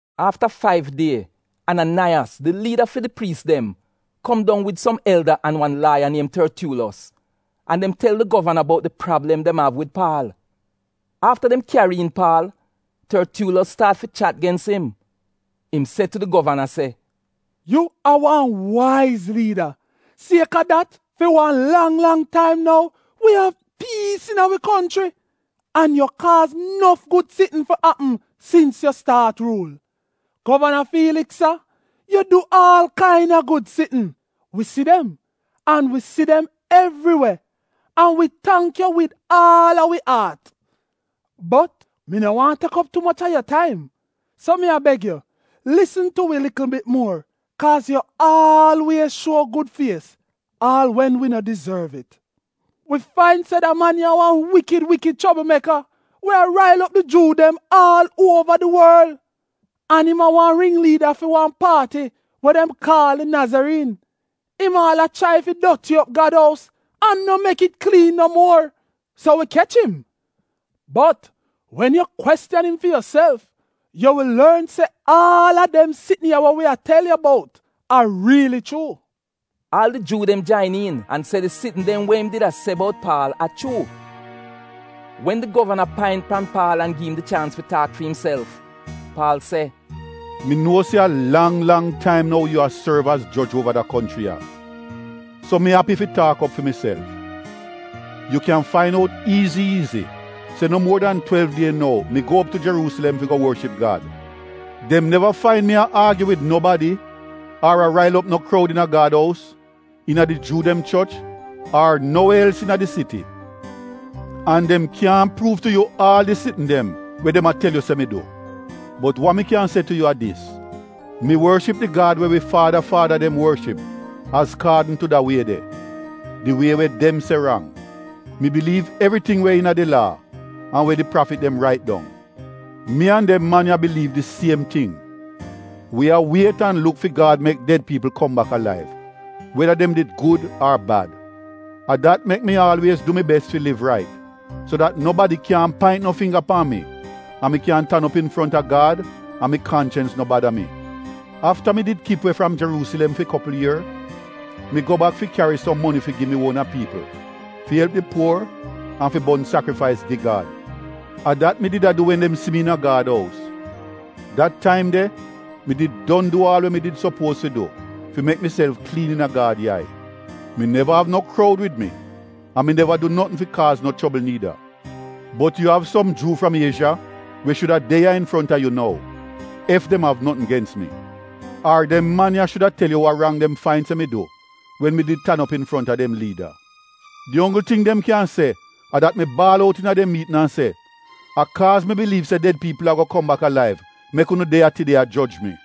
Afta faiv die Ananaiyas di liida fi di priis dem kom dong wid som elda an wan laaya niem Tortyuulos an dem tel di govana bout di prablem dem av wid Paal. Afta dem kyari iin Paal Tortyuulos staat fi chat gens im. Im se tu di govana se, “Yu a wan waiz liida. Sieka dat fi wan lang lang taim nou wi av piis iina wi konchri. An yu kaaz nof gud sitn fi apm sins yu staat ruul. Govana Fiiliks, Sa, yu du aal kaina gud sitn. Wi si dem, an wi si dem evri we an wi tangk yu wid aal a wi aat. Bot mi no waahn tek op tu moch a yu taim, so mi a beg yu, lisn tu wi likl bit muor kaaz yu aalwiez shuo gud fies aal wen wi no dizorv it. “Wi fain se da man ya a wan wikid wikid choblmeka we a rail op di Juu dem aal uova di worl, an im a wan ring liida fi wan paati we dem kaal di Nazariin. Im aal chrai fi doti op Gad ous an no mek it kliin no muor, so wi kech im. Bot wen yu kwestiyan im fi yuself yu wi lorn se aal a dem sitn ya wa wi a tel yu bout a riili chuu. Aal di Juu dem jain iin an se di sitn dem we im did a se bout Paal a chuu. Wen di govana paint pan Paal an gi im di chaans fi taak fi imself, Paal se: “Mi nuo se a lang lang taim nou yu a sorv az joj uova da konchri ya, so mi api fi taak op fi miself. Yu kyan fain out iizi iizi se no muor dan twelv die ago mi go op tu Jeruusilem fi go worship Gad. Dem neva fain mi a aagyu wid nobadi ar a rail op no kroud iina Gad ous, iina di Juu dem choch, ar no we els iina di siti. An dem kyaahn pruuv tu yu aal di sitn dem we dem a tel yu se mi du. Bot wa mi kyan se tu yu a dis, mi worship di Gad we wi faada faada dem worship azkaadn tu da Wie de — di Wie we dem se rang. Mi biliiv evriting we iina di Laa an we di prafit dem rait dong. Mi an dem man ya biliiv di siem ting. Wi a wiet an a luk fi Gad mek ded piipl kom bak alaiv, weda dem did gud ar bad. A dat mek mi aalwiez du mi bes fi liv rait so dat nobadi kyaahn paint no fingga pan mi an mi kyan tan op infronta Gad an mi kanchens no bada mi. Afta mi did kip we fram Jeruusilem fi kopl ier, mi go bak fi kyari som moni fi gi mi uona piipl fi elp di puor an fi bon sakrifais gi Gad. A dat mi did a du wen dem si mi iina Gad ous. Dat taim de mi did don du aal we mi did sopuoz fi du fi mek miself kliin iina Gad yai. Mi neva av no kroud wid mi, an mi neva du notn fi kaaz no chobl niida. Bot yu av som Juu fram Iezha we shuda de ya infronta yu nou, ef dem av notn gens mi. Ar dem man ya shuda tel yu wa rang dem did fain se mi du wen mi did tan op infronta dem liida. Di onggl ting dem kyan se a dat mi baal out iina dem miitn an se: ‘A kaaz mi biliiv se ded piipl ago kom bak alaiv mek unu de ya tide a joj mi’”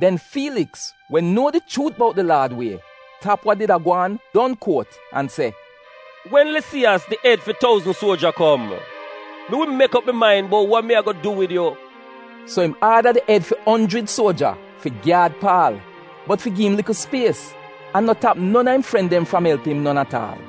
Den Fiiliks, we nuo di chuut bout di Laad Wie tap wa did a gwaan, don kuot an se, “Wen Lisiyas di ed fi touzn suoja kom, mi wi mek op mi main bout wa mi ago du wid yu.” So im aada di ed fi onjrid suoja fi gyaad Paal, bot fi gi im likl spies, an no tap non a im fren dem fram elp im non at aal.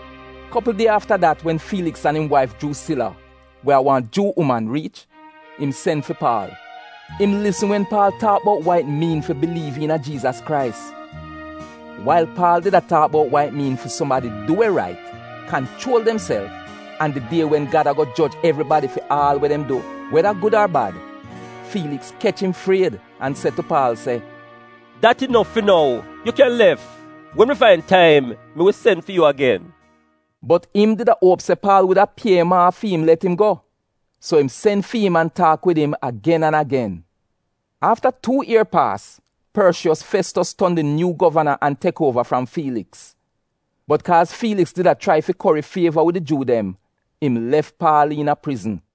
Kopl die afta dat wen Fiiliks an im waif Jruusila, we a wan Juu uman riich, im sen fi Paal. Im lisn wen Paal taak bout wa it miin fi biliiv iina Jiizas Krais. Wail Paal did a taak bout wa it miin fi sumadi du we rait, kanchuol demself, an di die wen Gad ago joj evribadi fi aal we dem du, weda gud ar bad, Fiiliks kech im fried an se tu Paal se, “Dat inof fi nou. Yu kyan lef. Wen mi fain taim mi wi sen fi yu agen.” Bot im did a uop se Paal wuda pie im aaf fi im let im go, so im sen fi im an taak wid im agen an agen. Afta tuu ier paas, Porshiyos Festos ton di nyuu govana an tek uova fram Fiiliks. Bot kaaz Fiiliks did a chrai fi kori fieva wid di Juu dem, im lef Paal iina prizn.